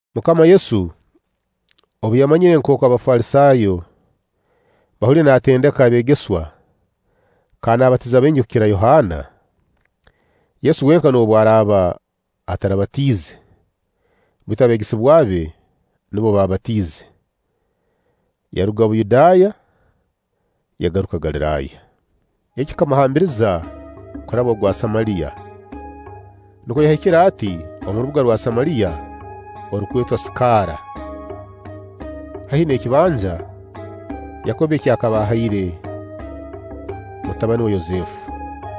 MUKAMA Yesu obu yamanyire nkooku Abafalisaayo bahuliire naatendeka abeegesebwa kandi naabatiza baingi kukira Yohaana (Yesu wenka noobu araaba atarabatiize, baitu abeegesebwa be nubo baabatiize), yaruga Buyudaaya yagaruka Galiraaya. Eki kikamuhambiriza kuraba ogwa Samaliya. Nukwo yahikire ati omu rubuga rwa Samaliya orurukwetwa Siikari, haihi n'ekibanja Yakobbo eki akaba ahaire mutabani we Yosefu.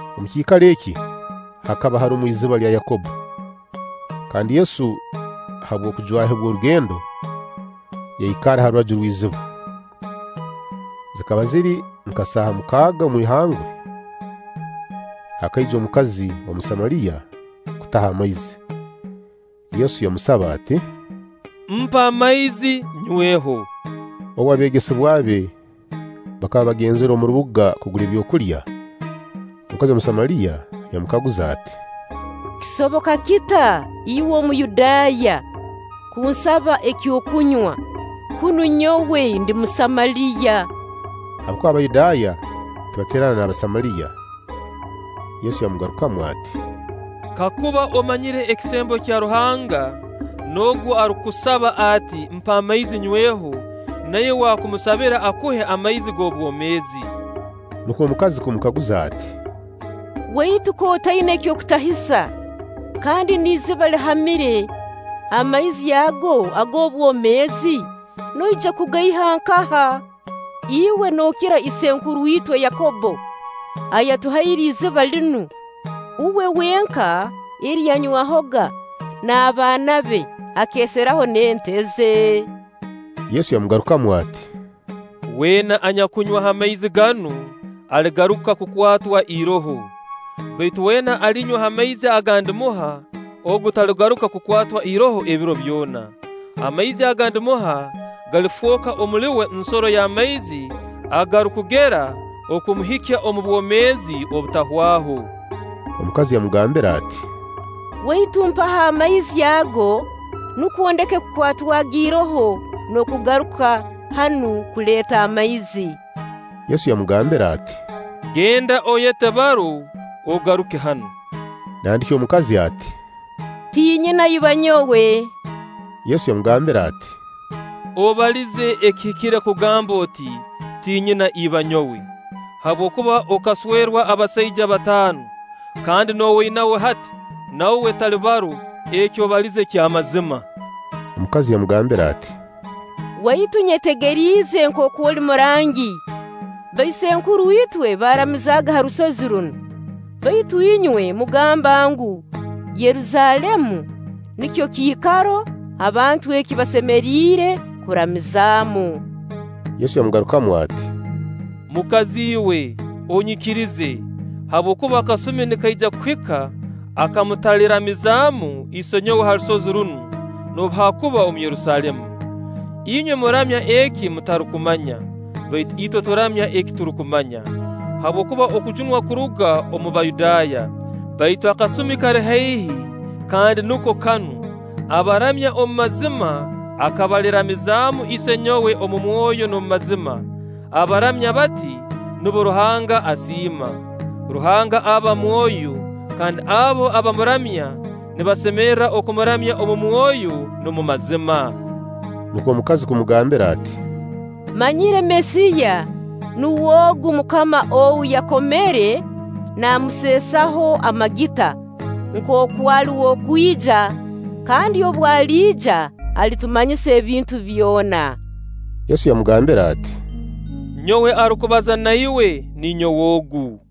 Omu kiikaro eki hakaba harumu iziba lya Yakobbo. Kandi Yesu habw'okujwahibwa orugendo yaikarra ha rubaju rw'iziba. Zikaba ziri nka saaha mukaaga omu ihangwe. Hakaija omukazi Omusamaliya kutaha amaizi. Yesu yamusaba ati: “Mpa amaizi nnyweho.” Obu, abeegesebwa be bakaba bagenzire omu rubuga kugura ebyokulya. Omukazi Omusamaliya yamukaguza ati: “Kisoboka kita iwe Omuyudaaya kunsaba eky'okunywa, kunu nyowe ndi Musamaliya?” Habwokuba Abayudaaya tibateerana n'Abasamaliya. Yesu yamugarukamu ati: “Kakuba omanyire ekisembo kya Ruhanga n'ogu arukukusaba ati: ‘Mpa amaizi nnyweho’, na iwe waakumusabire akuhe amaizi g'obwomeezi.” Nukwo omukazi kumukaguza ati: “Waitu k'otaina eky'okutahisa, kandi n'iziba lihamire; amaizi ago ag'obwomeezi noija kugaiha nkaha? Iwe nookira isenkuru itwe Yakobbo ayatuhaire iziba linu, uwe wenka eri yanywahoga n'abaana be, akeeseraho n'ente ze?” Yesu yamugarukamu ati: “Weena anyakunywa ha maizi ganu, aligaruka kukwatwa iroho; baitu weena alinywa ha maizi aga ndimuha, ogu taligaruka kukwatwa iroho ebiro byona. Amaizi aga ndimuha galifooka omuli uwe nsoro y'amaizi agarukugera okumuhikya omu bwomeezi obutahwaho.” Omukazi yamugambira ati: “Waitu mpaho amaizi ago, nukwo ndeke kukwatwaga iroho n'okugaruka hanu kuleeta amaizi.” Yesu yamugambira ati: “Genda oyete baro, ogaruke hanu.” Nandiki omukazi ati: “Tinyina iba nyowe.” Yesu yamugambira ati: “Obalize ekihikire kugamba oti: ‘Tinyina iba nyowe’; habwokuba okaswerwa abasaija bataano, kandi n'ow'oinawe hati, na uwe tali baro. Eki obalize ky'amazima.” Omukazi yamugambira ati: “Waitu, nyetegeriize nkooku oli murangi. Baisenkuru itwe baaramizaaga ha rusozi runu; baitu inywe mugamba ngu, Yerusaalemu nikyo kiikaro abantu eki basemeriire kuramizamu.” Yesu yamugarukamu ati: “Mukazi iwe, onyikirize, habwokuba akasumi nikaija kuhika aka mutaliramizaamu Isenyowe ha rusozi runu, noobu haakuba omu Yerusaalemu. Inywe muramya eki mutarukumanya; baitu itwe turamya eki turukumanya, habwokuba okujunwa kuruga omu Bayudaaya. Baitu akasumi kali haihi, kandi nuko kanu, abaramya omu mazima aka baliramizaamu Isenyowe omu mwoyo n'omu mazima; abaramya bati, nubo Ruhanga asiima. Ruhanga aba mwoyo, kandi abo abamuramya nibasemerra okumuramya omu mwoyo n'omu mazima.” Nukwo omukazi kumugambira ati: “Mmanyire Mesiya (nuwe ogu Mukama ou yakomere namuseesaho amagita) nkooku ali w'okwija kandi obu aliija alitumanyisa ebintu byona.” Yesu yamugambira ati: “Nyowe arukubaza na iwe, ninyowe ogu.”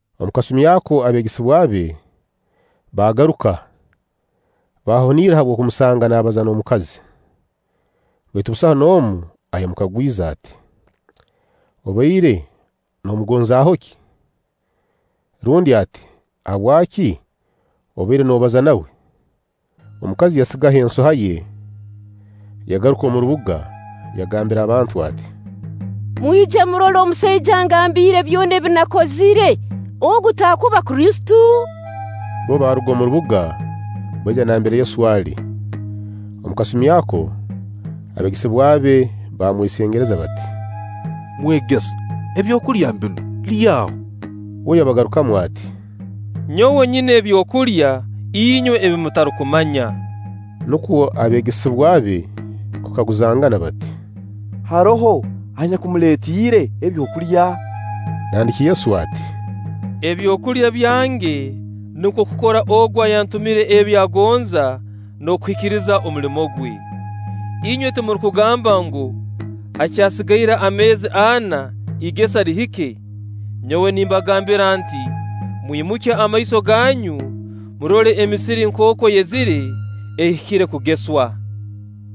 Omu kasumi ako abeegesebwa be baagaruka, baahunirra habw'okumusanga naabaza n'omukazi, baitu busaho n'omu ayamukagwize ati: “Obaire noomugonzaaho ki?” Rundi ati: “Habwaki obaire noobaza na uwe?” Omukazi yasigaho ensoha ye, yagaruka omu rubuga, yagambira abantu ati: “Mwije murole omusaija angambiire byona ebi nakozire. Ogu taakuba Kristo?” Bbo baaruga omu rubuga, baija nambere Yesu ali. Omu kasumi ako, abeegesebwa be baamwesengereza bati: “Mwegesa, ebyokulya mbinu, lyaaho.” Uwe yabagarukamu ati: “Nyowe nyina ebyokulya inywe ebi mutarukumanya.” Nukwo abeegesebwa be kukaguzangana bati: “Haroho anyakumuleetiire ebyokulya?” Nandiki Yesu ati: “Ebyokulya byange nukwo kukora Ogu ayantumire ebi agonza, n'okuhikiriza omulimo gwe. Inywe timurukugamba ngu: ‘Hakyasigaire ameezi ana, igesa lihike’? Nyowe nimbagambira nti: Mwimukye amaiso ganyu, murole emisiri nkooku eyezire, ehikire kugeswa.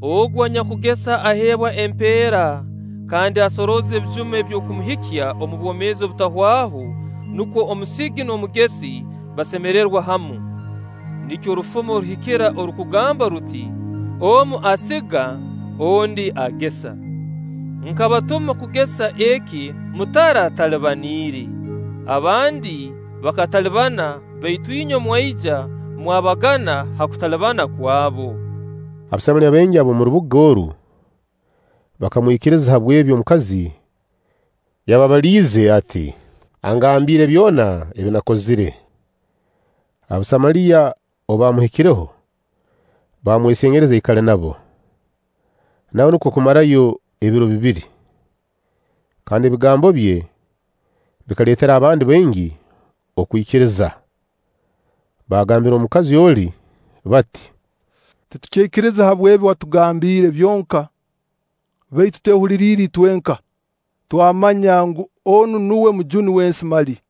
Ogu anyakugesa aheebwa empeera kandi asorooza ebijuma eby'okumuhikya omu bwomeezi obutahwaho, nukwo omusigi n'omugesi basemererwe hamu. Nikyo orufumo ruhikira orurukugamba ruti: ‘Omu asiga, ondi agesa.’ Nkabatuma kugesa eki mutaratalibaniire; abandi bakatalibana, baitu inywe mwaija, mwabagana ha kutalibana kwabo.” Abasamaliya baingi ab'omu rubuga oru bakamwikiriza habw'ebi omukazi yababaliize ati: “Angambiire byona ebi nakakozire.” Abasamaliya obu baamuhikireho, baamwesengereza aikale nabo; nawe nukwo kumarayo ebiro bibiri. Kandi ebigambo bye bikaleetera abandi baingi okwikiriza. Baagambira omukazi oli bati: “Titukyaikiriza habw'ebi watugambiire byonka, baitu twehuliriire itwenka, twamanya ngu, onu nuwe Mujuni w'ensi mali.”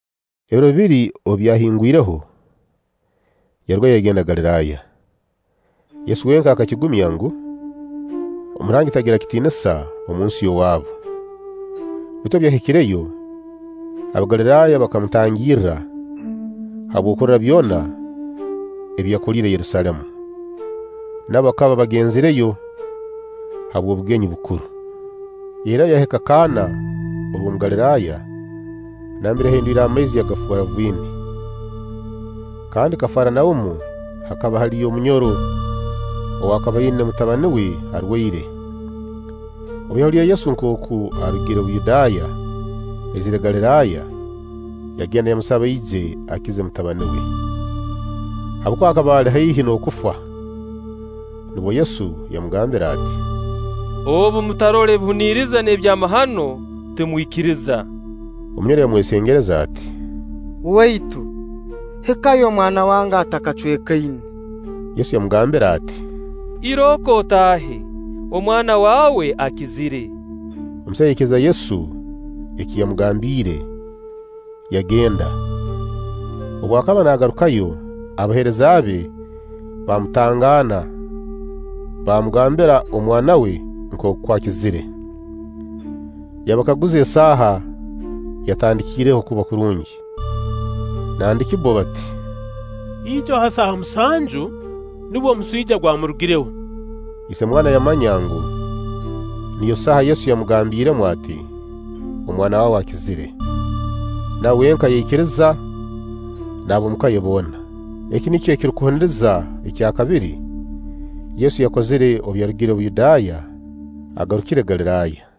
Ebiro bibiri obu byahingwireho, yarugayo yagenda Galiraaya. Yesu wenka akakigumya ngu, Omurangi tagira kitiinisa omunsi y'owaabu. Baitu obu yahikireyo, Abagaliraaya bakamutangirra habw'okurora byona ebi yakoliire Yerusaalemu. Nabo bakaba bagenzireyo habw'obugenyi bukuru. Yairrayo yahika Kana orw'omu Galiraaya, nambere yahinduliire amaizi yagafoora viini. Kandi Kafaranaumu hakaba haliyo omunyoro ow'akaba aina mutabani we arwaire. Obu yahuliire Yesu nkooku arugire Buyudaaya aizire Galiraaya, yagenda yamusaba aije akize mutabani we, habwokuba akaba ali haihi n'okufa. Nubwo Yesu yamugambira ati: “Obu mutarora ebihuniriza n'ebyamahano, timwikiriza.” Omunyoro yamwesengereza ati: “Waitu, hikayo omwana wange atakacwekaine.” Yesu yamugambira ati: “Irooko otaahe, omwana waawe akizire.” Omusaija yaikiriza Yesu eki yamugambiire, yagenda. Obu akaba naagarukayo, abaheereza be baamutangaana baamugambira omwana we nkooku akizire. Yabakaguza esaaha yatandikiireho kuba kurungi. Nandiki bbo bati: “Ijo ha saaha musanju nubwo omuswija gwamurugireho.” Ise omwana yamanya ngu, niyo saaha Yesu yamugambiiremu ati: “Omwana waawe akizire.” Na uwe wenka yaikiriza n'ab'omuka ye boona. Eki nikyo ekirukuhuniriza ekya kabiri Yesu yakozire obu yarugire Buyudaaya agarukire Galiraaya.